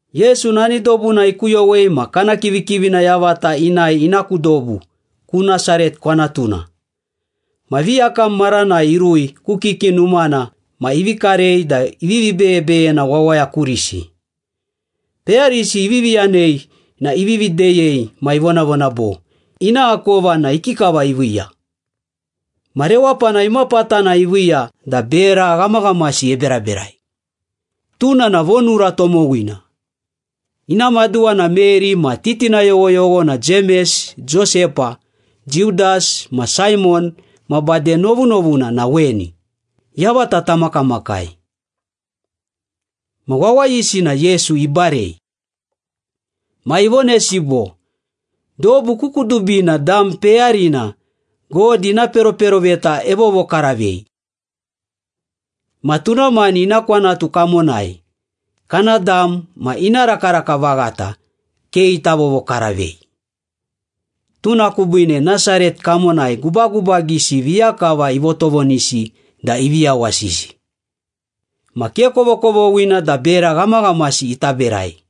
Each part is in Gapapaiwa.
Yesu nani dobuna ikuyowei ma kana kivikivina yavata inae ina ku dobu, ku Nasaret kwanatuna. Ma viyakam maranai irui ku kiki numana ma ivi karei da ivivi beyebeyena wawaya kurisi. Peyarisi ivivi yanei na ivivi deyei ma ivonavona bo, “Ina akova na ikikava iviiya? Ma rewapana imapatana iviiya da bera ghamaghamasi eberaberai? Tuna na vonura tomowina. Ina maduwa na Meri ma titina yoghoyogho na Jemes, Josepa, Judas ma Saimon ma bade novunovuna na weni, yavata tamakamakai.” Ma wawayisi na Yesu ibarei. Ma ivonesi bo, “Dobu ku kudubina dam peyarina God ina peroperoveta evovokaravei. Ma tuna mani ina kwanatu kamonai, kana dam ma ina rakaraka vaghata ke ita vovokaravei.” Tuna kubiine Nasaret kamonai gubagubagisi viya kava ivotovonisi da ivi yawasisi. Ma ke kovokovoghina da bera ghamaghamasi ita berai.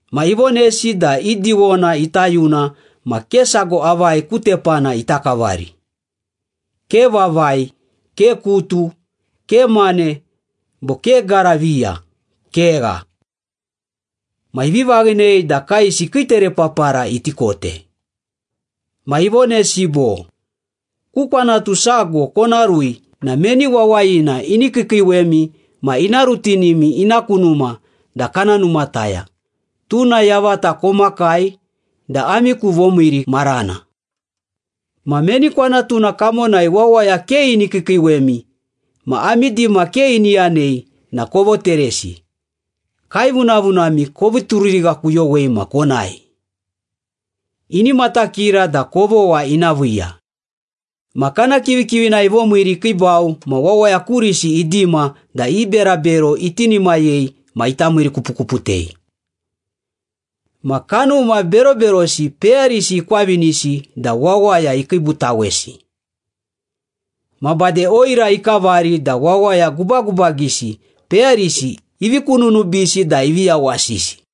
Ma ivonesi da i diwona ita yuna ma ke sago avai ku tepana ita kavari. Ke vavai, ke kutu, ke mane bo ke gara viya, kegha. Ma ivi vaghinei da kaesi kii terepapara iti kote. Ma ivonesi bo, “Ku kwanatu sago kona rui na meni wawayina ini kiikiiwemi ma ina rutinimi ina ku numa da kana numataya, tuna yavata komakai da ami ku vomiiri marana. Ma meni kwanatuna kamonai wawaya ke ini kiikiiwemi ma ami dima ke ini yanei na kovoteresi. Kaevunavunami kovi turirighakuyowei ma konae. Ini matakira da kovogha ina viiya.” Ma kana kivikivina ivomiiri ikiibau ma wawaya kurisi idima da i berabero itinimayei ma ita miirikupukuputei. Ma kanuma beroberosi peyarisi ikwavinisi da wawaya ikiibutawesi. Ma bade oira ikavari da wawaya gubagubagisi peyarisi ivi kununubisi da ivi yawasisi.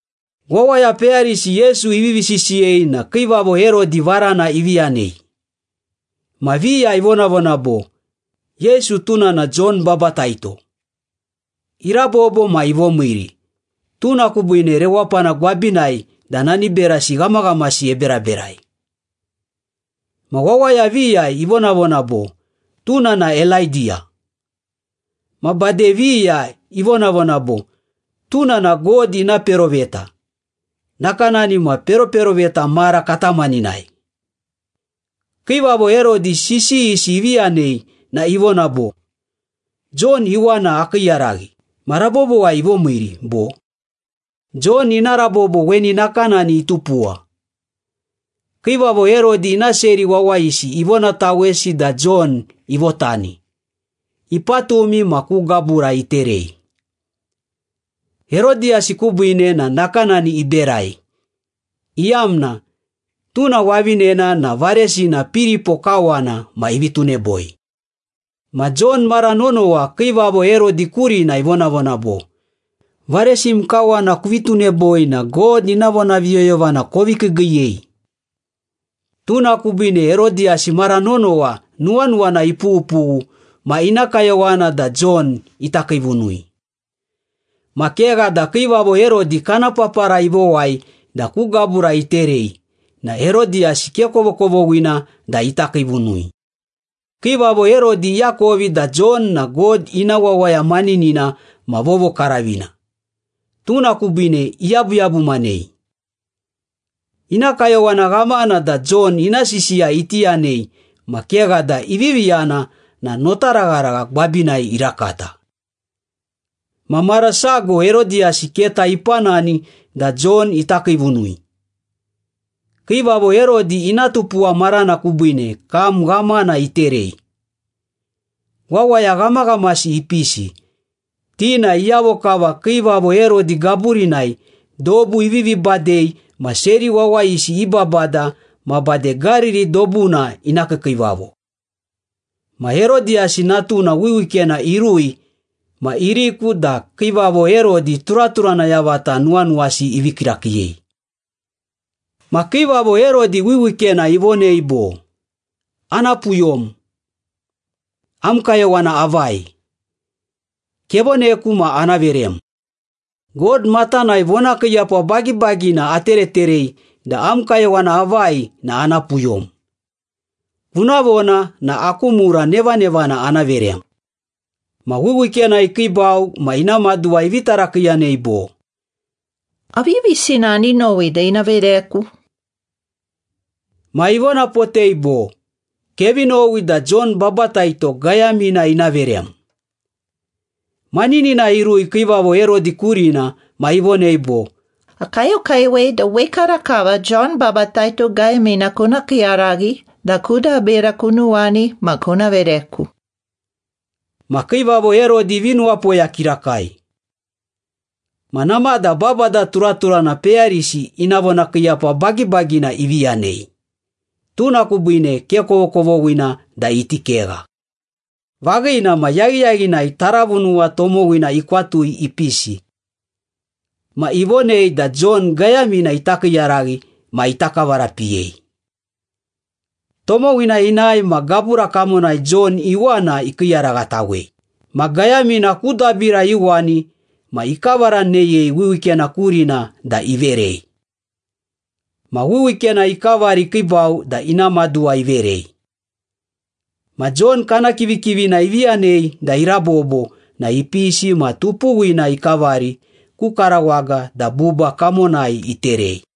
Wawaya peyarisi Yesu ivivi sisiyei na Kiivavo Herodi varana ivi yanei. Ma viya ivonavona bo, “Yesu tuna na Jon Babataito. Irabobo ma ivomiiri, tuna kubiine rewapana gwabinai da nani berasi ghamaghamasi eberaberai.” Ma wawaya viya ivonavona bo, “Tuna na Elaidiya.” Ma bade viya ivonavona bo, “Tuna na God ina peroveta, nakanani ma peroperoveta mara katamaninai.” Kiivavo Herodi sisiyisi ivi yanei na ivona bo, “Jon iwana akiiyaraghi ma rabobowai ivomiiri, bo?” Jon ina rabobo weni nakanani itupuwa. Kiivavo Herodi ina seri wawayisi ivonatawesi da Jon ivotani, ipatumi ma ku gabura iterei. Herodiyasi kubiine na nakanani iberai, iyamna tuna wavinena na varesina Piripo kawana ma ivi tuneboi. Ma Jon mara nonowa Kiivavo Herodi kurina ivonavona bo, “Varesim kawana kuvi tuneboi na God ina vonaviyoyovana kovi kiigiiyei.” Tuna kubiine Herodiyasi mara nonowa nuwanuwana ipughupughu ma ina kayowana da Jon ita kiivunui. Ma kegha da Kiivavo Herodi kana papara ivowai da ku gabura iterei na Herodiyasi ke kovokovoghina da ita kiivunui. Kiivavo Herodi iakovi da Jon na God ina wawaya maninina ma vovokaravina, tuna kubiine iyabuyabumanei. Ina kayowana ghamana da Jon ina sisiya iti yanei ma kegha da ivivi yana na notaragharagha gwabinai irakata. Ma mara sago Herodiyasi keta ipanani da Jon ita kiivunui. Kiivavo Herodi ina tupuwa marana kubiine kam ghamana iterei. Wawaya ghamaghamasi ipisi, ti na iyavo kava Kiivavo Herodi gaburinai dobu ivivi badei ma seri wawayisi i babada ma bade Gariri dobuna ina kiikiivavo. Ma Herodiyasi natuna wiwikena irui ma iriku da Kiivavo Herodi turaturana yavata nuwanuwasi ivii kirakiiyei. Ma Kiivavo Herodi wiwikena ivonei bo, “Ana puyom. Am kayowana avai? Kevoneku ma ana verem. God matanai vonakiiyapa bagibagina atereterei da am kayowana avai na ana puyom. Kuna vona na aku mura nevanevana ana verem.” Ma wiwikena ikiibau ma ina maduwa ivi tarakiiyanei bo, “Aviyavisina ani nowi da ina vereku?” Ma ivonapotei bo, “Kevi nowi da Jon Babataito gayamina ina verem.” Maninina irui Kiivavo Herodi kurina ma ivonei bo, “Akayokayowei da wekarakava Jon Babataito gayamina kuna kiiyaraghi da ku dabira kunuwani ma kuna vereku.” Ma Kiivavo Herodi ivi nuwapoya kirakai. Ma namada babada turaturana peyarisi ina vonakiiyapa bagibagina ivi yanei, tuna kubiine ke kovokovoghina da iti kegha. Vaghina ma yaghiyaghinai taravunuwa tomowina ikwatu ipisi. Ma ivonei da Jon gayamina ita kiiyaraghi ma ita kavarapiyei. Tomowina inae ma gabura kamonai Jon iwana ikiiyaraghatawei, ma gayamina ku dabira iuwani ma ikavaraneyei wiwikena kurina da iverei. Ma wiwikena ikavari ikiibau da ina maduwa iverei. Ma Jon kana kivikivina ivi yanei da irabobo na ipisi ma tupuwina ikavari ku karawaga da buba kamonai iterei.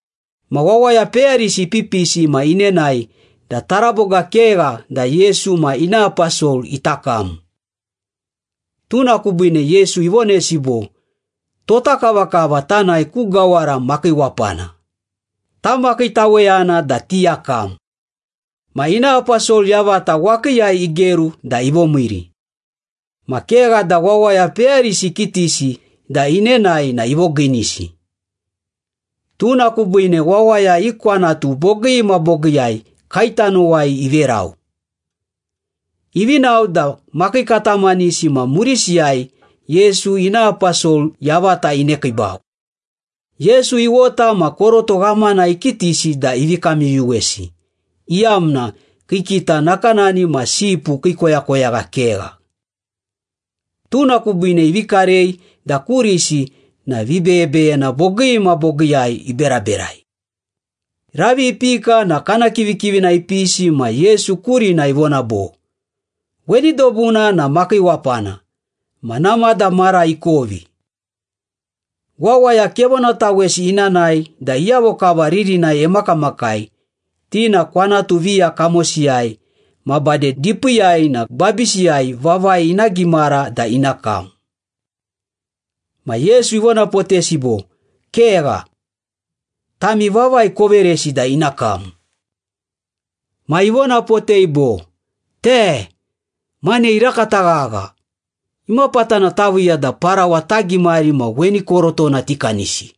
Ma wawaya peyarisi ipipisi ma inenae da taraboga kegha da Yesu ma ina aposol ita kam. Tuna kubiine Yesu ivonesi bo, “Tota kavakava tanae ku gawara makiiwapana, tamakiitaweyana da tiyakam.” Ma ina aposol yavata wakiiyai igeru da ivomiiri. Ma kegha da wawaya peyarisi ikitisi da inenae na ivogiinisi. Tuna kubiine wawaya i kwanatu bogii ma bogiiyai kaetanowai iverau. Ivi nao da makii katamanisi ma murisiyai Yesu ina aposol yavata inekiibau. Yesu iwota ma koroto ghamana ikitisi da ivi kamyuyuwesi, iyamna kii kita nakanani ma sipu kii koyakoyagha kegha. Tuna kubiine ivi karei da kurisi na vibeyebeyena bogii ma bogiiyai iberaberai. Ravi ipika na kana kivikivina ipisi ma Yesu kurina ivona bo, “Weni dobuna na makiiwapana ma namada mara ikovi. Wawaya kevonatawesi ina nae da iyavo kava ririnai emakamakai, ti na kwanatu viya kamosiyai ma bade dipiiyai na gwabisiyai vavai ina gimara da ina kam.” Ma Yesu ivonapotesi bo, “Kegha. Tami vavai koveresi da ina kam.” Ma ivonapotei bo, “Te! Mane irakata ghagha! Imapatana taviiya da parawa tagimari ma weni korotona tikanisi?”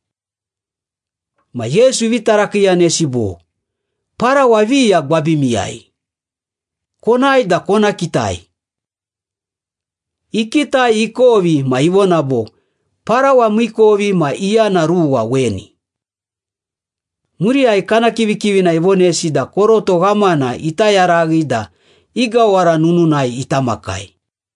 Ma Yesu ivi tarakiiyanesi bo, “Parawa viya gwabimiyai? Konae da kona kitai.” Ikitai ikovi ma ivona bo, “Parawa miikovi ma iyana ruwa weni.” Muriyai kana kivikivina ivonesi da koroto ghamana ita yaraghi da i gawara nununai ita makai.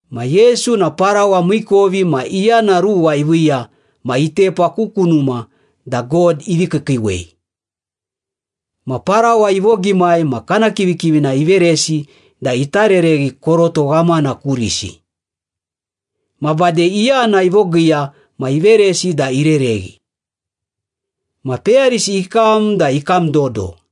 Ma Yesu na parawa miikovi ma iyana ruwa iviiya ma itepa ku kunuma da God ivi kiikiiwei. Ma parawa ivogimai ma kana kivikivina iveresi da ita rereghi koroto ghamana kurisi. Ma bade iyana ivogiiya ma iveresi da irereghi. Ma peyarisi ikam da ikam dodo.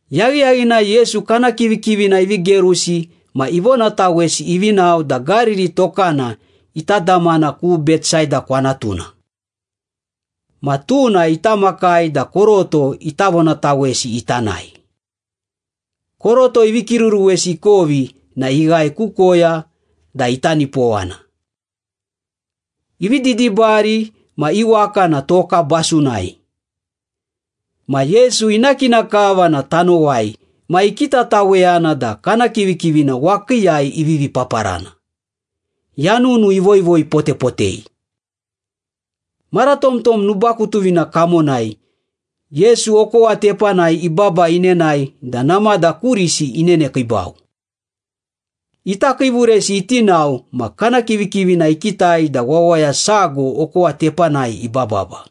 Yaghiyaghinai Yesu kana kivikivina ivi gerusi ma ivonatawesi ivi nao da Gariri tokana ita damana ku Betsaida kwanatuna. Ma tuna ita makai da koroto ita vonatawesi ita nae. Koroto ivi kiruruwesi ikovi na ighae ku koya da ita nipowana. Ivi didibari ma i waka na toka basunai. Ma Yesu ina kina kava na tanowai ma ikitataweyana da kana kivikivina wakiiyai ivivi paparana, yanunu ivoivoi potepotei. Mara tomtom nubakutuvina kamonai, Yesu okowa tepanai ibaba inenae da namada kurisi inenekiibau. Ita kiivuresi iti nao ma kana kivikivina ikitai da wawaya sago okowa tepanai ibababa,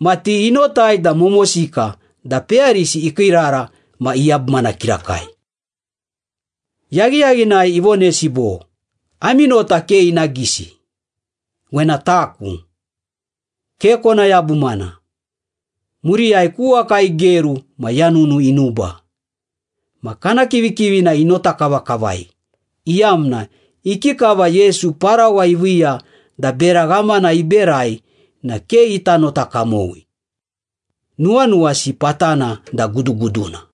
ma ti inotai da momosika da peyarisi ikiirara ma iyabumana kirakai. Yaghiyaghinai ivonesi bo, “Ami nota ke ina gisi. Wena taku. Ke kona yabumana.” Muriyai ku waka igeru ma yanunu inuba. Ma kana kivikivina inota kavakavai, iyamna ikikava Yesu parawa iviiya da bera ghamana iberai na ke ita nota kamowi. Nuwanuwasi patana da guduguduna.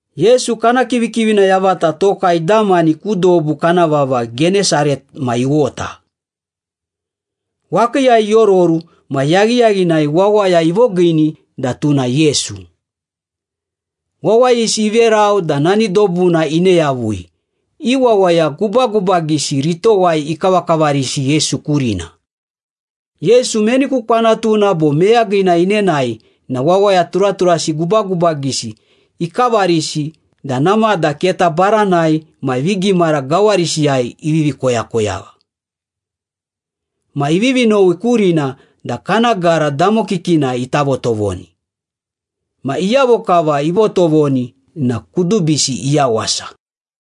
Yesu kana kivikivina yavata toka idamani ku dobu kana vava Genesaret ma iwota. Wakiiyai iororu ma yaghiyaghinai wawaya ivogiini da tuna Yesu. Wawayisi iverau da nani dobuna ine yavui, i wawaya gubagubagisi ritowai ikavakavarisi Yesu kurina. Yesu meni ku kwanatuna bo meyagina inenae na wawaya turaturasi gubagubagisi ikavarisi da namada keta baranai ma vigimara gawarisiyai ivivi koyakoyagha. Ma ivivi nowi kurina da kana gara damokikina ita votovoni. Ma iyavo kava ivotovoni na kudubisi iyawasa.